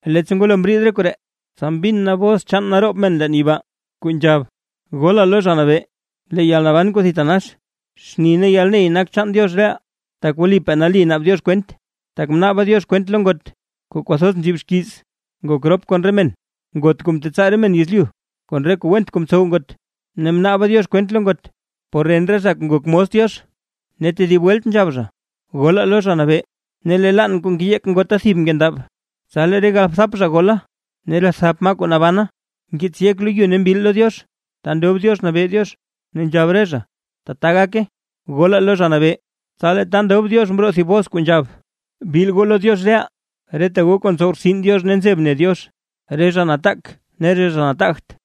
Leettsa ngwalo mriid re koree, tsa mbin na bos chaan naroob men leen yibaa, kuu nzhab: ¡Golaa lo Zha Nabee! Lee yalnaban kuu thitanax, xni ne yalney nak chaan Diox reʼaa, tak wlipaa nali naab Diox kwent; tak mnaaba Diox kwent lo ngot, kuu kwathoz nzib xkiiz ngok rop kon re men, ngot kuu mtetsaa re men yezlyu kon re kuu went kuu mtsow ngot; ne mnaaba Diox kwent lo ngot por ren re zha kuu ngok mos Diox. Ne tedib welt nzhab zha: ―¡Golaa lo Zha Nabee! Ne lee laann kuu ngeyeek ngota thib nkendab. Tsa lee re galbthap zha gola ne re thap maa kuu nabana, mkiits yek lo yu ne mbil lo Diox, ta ndob Diox nabee Diox, ne nzhab re zha: ―¡Tata gake! ¡Golaa lo Zha Nabee! Tsa lee ta ndob Diox mroo thib bos kuu nzhab: ¡Bil goo lo Diox reʼaa, reta goo kuu ntsow rtsin Diox ne nzeb ne Diox, re zha nataak ne re zha nataagt!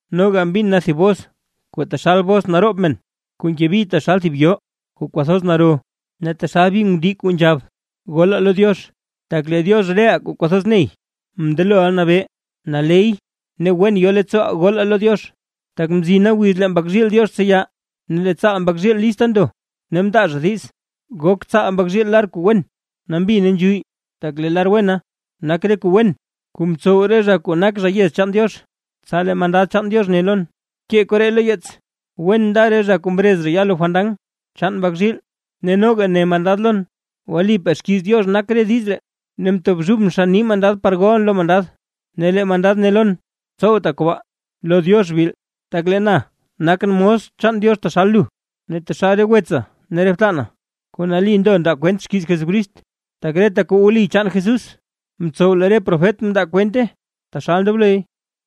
Noga mbin na thib bos kuu taxal bos naroob men, kuu nke bi taxal thib yoo kuu kwathoz naro, ne taxal bi ngundii, kuu mbez: ¡Golaa lo Diox! Tak lee Diox reʼaa kuu kwathoz ney, mndeloʼa nabee. Naley ne wen yo leettsooʼaa ne golaa lo Diox, tak mzina wiz kuu lee Mbak zhiil Diox tseya, ne lee tsaal Mbak zhiil lista ndo. Ne mndaa zha diiz, gok tsaal Mbak zhiil lar kuu wen, nambi ne nzhuyy. Tak lee lar wena, nak re kuu wen kuu mtsow re zha kuu nak zha yez chaan Diox. Tsa lee mandad chaan Diox ne lon: ―Bkee koree lo yeets: “Wen nda re zha kuu mrez zha ya lo fandan chaan Mbak zhiil”. Ne noga ne mandad lon: ―Wlipaa xkiiz Diox nak re diiz ree. Ne mtobxubʼn xann nii mandad par golʼn lo mandad, ne lee mandad ne lon: ―Tsowta kobaa, lo Diox bil; tak lee na nakʼn mos chaan Diox taxal lu ne taxal re wetsa ne re btana, kuu nali ndo ndaa kwent xkiiz Jesucrist. Tak reta kuu wli chaan Jesús mtsow lee re profet mndaa kwente taxal ndobloy.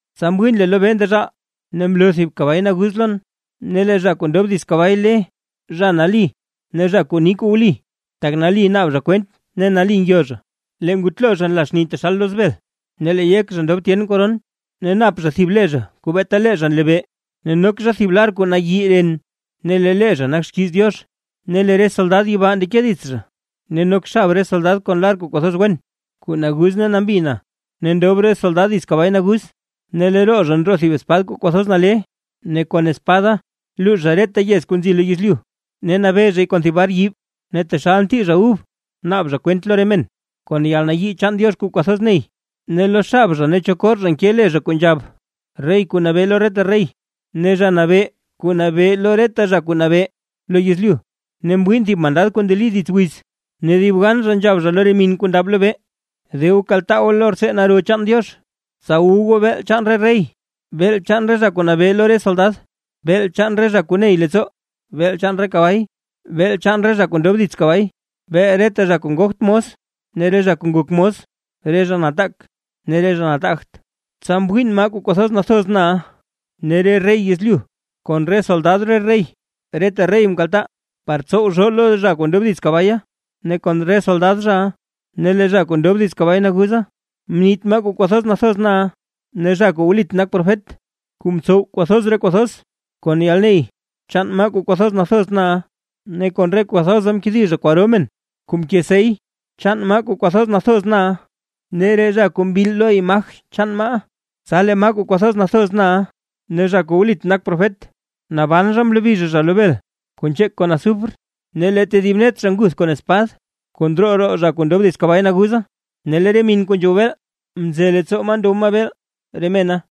Tsa mwiin lee lobee ndezhaal, ne mloo thib kabay naguz lon, ne lee zha kuu ndob dits kabay le Zha Nali ne Zha kuu ni kuu wli, tak nali naab zha kwent ne nali ngyo zha. Lee ngutlo zha nla xni taxal loz bel, ne lee yek zha ndob tyen koron, ne nap zha thib le zha kuu beeta lee zha nlebee. Ne nok zha thib lar kuu nayi ren, ne lee le zha nak xkiiz Diox. Ne lee re soldad yibaa ndeke dits zha, ne nok xab re soldad kon lar kuu kwathoz wen, kuu naguz ne nambi na, ne ndob re soldad dits kabay naguz. Ne lee roo zha ndroo thib espad kuu kwathoz nale, ne kon espada luux zha reta yez kuu nzi lo yezlyu. Ne nabee zhay kon thib bar yiib. Ne taxal ntii zha ub, naab zha kwent lo re men, kon yalnayii chaan Diox kuu kwathoz ney. Ne lo xab zha ne cho kor zha nke le zha kuu nzhab: “Rey kuu nabee lo reta rey, ne Zha Nabee kuu nabee lo reta zha kuu nabee lo yezlyu”. Ne mwiin thib mandad kuu ndeli dits wiz, ne dib gan zha nzhab zha lo re min kuu ndab lobee: ―¡De goo kaltaa goo lo rtsee naro chaan Diox, tsa wu goo beel chaan re rey, beel chaan re zha kuu nabee lo re soldad, beel chaan re zha kuu ney leettsoo, beel chaan re kabay, beel re zha kuu mndob dits kabay, beel reta zha kuu ngogt mos ne re zha kuu ngok mos, re zha nataak ne re zha nataagt! Tsa mwiin maa kuu kwathoz nathoz na ne re rey yezlyu kon re soldad re rey, reta rey mkaltaa, par tsow zhoo lo zha kuu ndob dits kabaya ne kon re soldad zhaʼa. Ne lee zha kuu ndob dits kabay naguza, mniit maa kuu kwathoz nathoz na ne zha kuu wlit nak profet, kuu mtsow kwathoz re kuu thoz kon yalney chaan maa kuu kwathoz nathoz na. Ne kon re kuu thoza mkedi zha kwaro men, kuu mke sey chaan maa kuu kwathoz nathoz na, ne re zha kuu mbil lo imaj chaan maaʼa. Tsa lee maa kuu kwathoz nathoz na ne zha kuu wlit nak profet, naban zha mlobi zha zha lo bel kuu nzheek kon azufre. Ne lee tedib net zha nguth kon spad, kuu ndroo roo zha kuu ndob dits kabay naguza, ne lee re min kuu nzhow beel mze leettsoo maa ndow maa beel re mena.